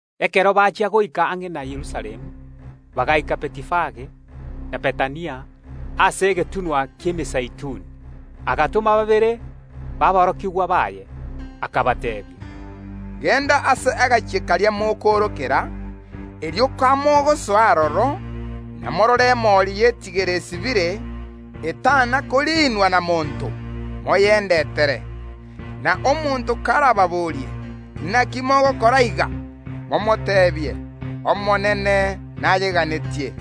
Ekero bachia goika ang’e na Yerusalemu, bagaika Betifage na Bethania, ase egetunwa ki’Emezeituni, Yeso agatoma babere baborokigwa baye, akabateebia, “Genda ase ekenyoro keria mokoorokera, erio kamogosoa aroro, namorore emori y’etigere esibire, etana koriinwa na monto; moyendetere. Na omonto karababorie: Inaki mogokora iga? Momoteebie: Omonene nayeganetie,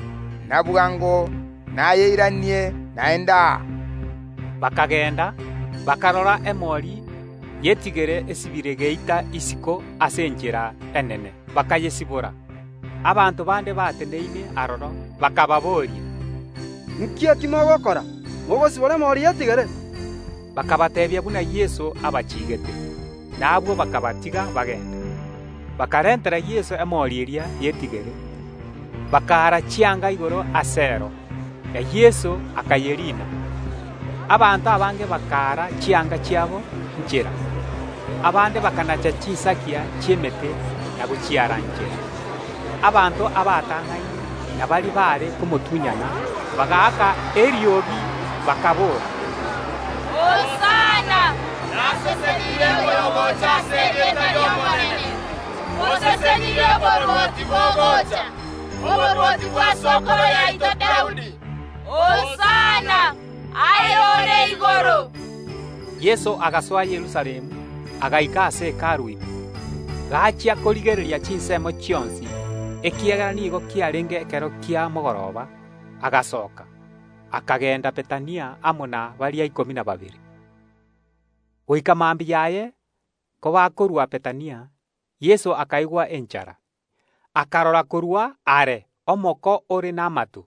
na bwango nayeiranie naende aa.” Bakagenda, bakarora emori y’etigere esibire geita isiko ase enchera enene; bakayesibora. Abanto bande bateneine aroro, bakababoria, “Inki ekio mogokora, mogosibora emori y’etigere?” Bakabateebia buna Yeso abachiigete; na abwo bakabatiga bagende. Bakarentera Yeso emori eria y’etigere, bakaara chianga igoro asero, na Yeso akayeriina. Abanto abange bakaara chianga chiabo inchera; abande bakanacha chinsagia chi’emete na gochiara inchera. Abanto abatang’aine na baria baare komotunyana bagaaka eriogi, bakaboora, “Hosana! Nasesenirie oyogocha ase erieta ri’Omonene! Mbosesenirie oborwoti bogocha, oborwoti bwa sokoro yaito Daudi! Hosana aye ore igoro!” Yeso agasoa Yerusalemu agaika ase Hekalu ime; akarigereria buya chinsemo chionsi kera egento. Korende ase engencho nigo kiarenge ekero kia mogoroba, agasoka, akagenda Bethania amo na baria ikomi na babere. Rituko riare kobwatia kobakorwa Bethania Yeso akaigwa enchara. Akarora korwa are omoko ore namato,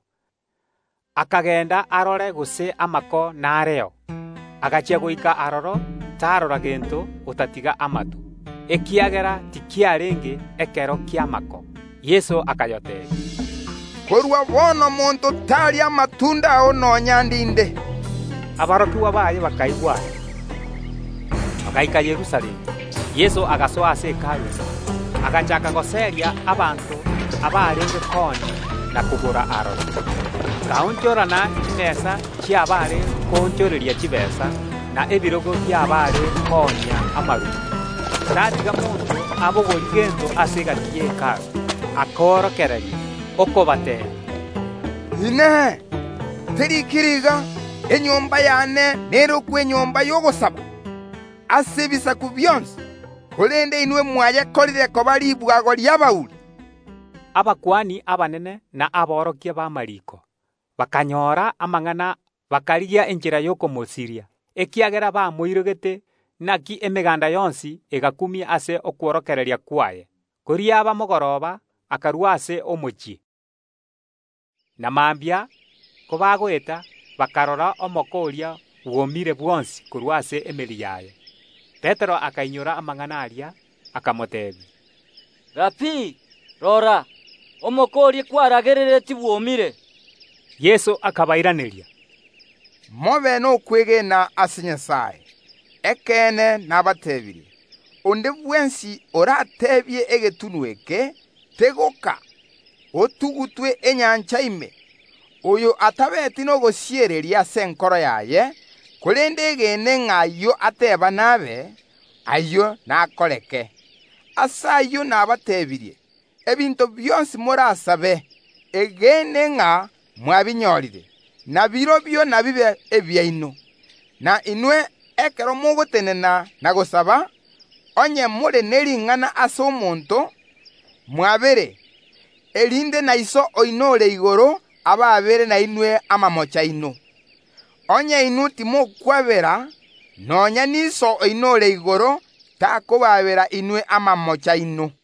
akagenda arore gose amako nareo. Agachia goika aroro tarora gento otatiga amato, ekiagera tikiarenge ekero ki’amako. Yeso agateebia omoko oria, “Korwa bono monto taria amatunda ao nonya ndinde.” Aborokigwa baye bakaigwa aya. Bagaika Yerusalemu. Yeso agasoa ase Hekalu ime, agachaaka goseria abanto abarenge koonia na kogora aroro, agaonchorana chimesa chi’abaare goonchoreria chitaabu, na ebirogo bi’abaare koonia amaruma; tatiga monto abogorie gento ase egati ye Hekalu. Akorokereria, okobateebia, “Inee! Teriikiri iga: Enyomba y’ane nerokwe enyomba y’ogosaba ase ebisaku bionsi? Korende inwe mwayekorire koba ribwago ri’abauri.” Abakuani abanene na aborokia b’amariiko bakanyora amang’ana, bakarigia enchera y’okomosiria, ekiagera bamoirogete; naki emeganda yonsi egakumia ase okworokereria kwaye. Koriaba mogoroba akarua ase omochie. Na mambia kobagoeta, bakarora omoko oria bwomire bwonsi korwa ase emeri yaye. Petero akainyora amang’ana aria, agateebia Yeso, “Rabii, rora, omoko oria kwaragereretie bwomire.” Yeso akabairaneria, “Mobe nokwegena ase Nyasae. Ekeene nabateebirie: Onde bwensi orateebie egetunwa eke: Tegoka, otugutwe enyancha ime; oyo atabeeti nogosiereria ase enkoro yaye, korende egene ng’a ayio ateeba nabe, ayio nakoreke. Ase ayio nabateebirie, ebinto bionsi morasabe, egene ng’a mwabinyorire, nabirobio inabibe ebiaino. Na inwe, ekero mogotenena na gosaba, onye more ne ring’ana ase omonto, mwabere, erinde na Iso oino ore igoro abaabere nainwe amamocho aino. [ Onye inwe timokwabera, nonya n’Iso oino ore igoro takobaabera inwe amamocho aino.]”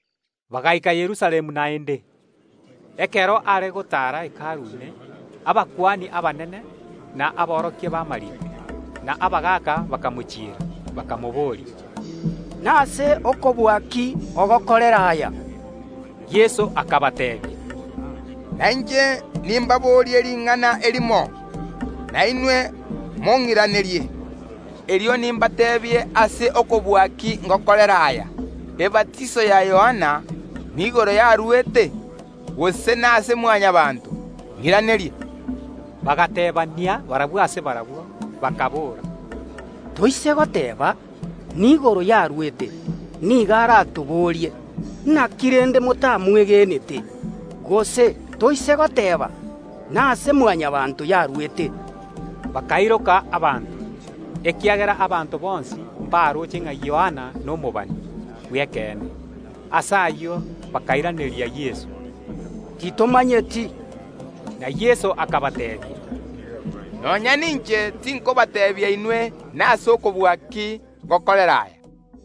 Bagaika Yerusalemu naende. Ekero Yeso are gotaara Hekalu ime, abakuani abanene, na aborokia b’amariiko, na abagaaka bakamochiera, bakamobooria, “Nase okobua ki ogokorera aya?” Yeso akabateebia, “Nainche nimbaborie ring’ana erimo, nainwe mong’iranerie, erio nimbateebie ase okobua ki ngokorera aya. Ebatiso ya Yohana, niigoro yarwete igoro, gose nase Mwanyabaanto? Ng’iranerie.” Bagateebania barabwo ase barabwo, bakaboora, “Toise goteeba: Niigoro yarwete, nigo aratoboorie: Inaki rende motamwegenete? Gose toise goteeba: Nase Mwanyabaanto yarwete?” — Bakairoka abanto, ekiagera abanto bonsi mbaroche ng’a Yohana nomobani bw’ekeene. Ase ayio bakairaneria Yeso, “Titomanyeti.” Na Yeso akabateebia “Nonya ninche tinkobateebia inwe nase okobua ki ngokorera aya.”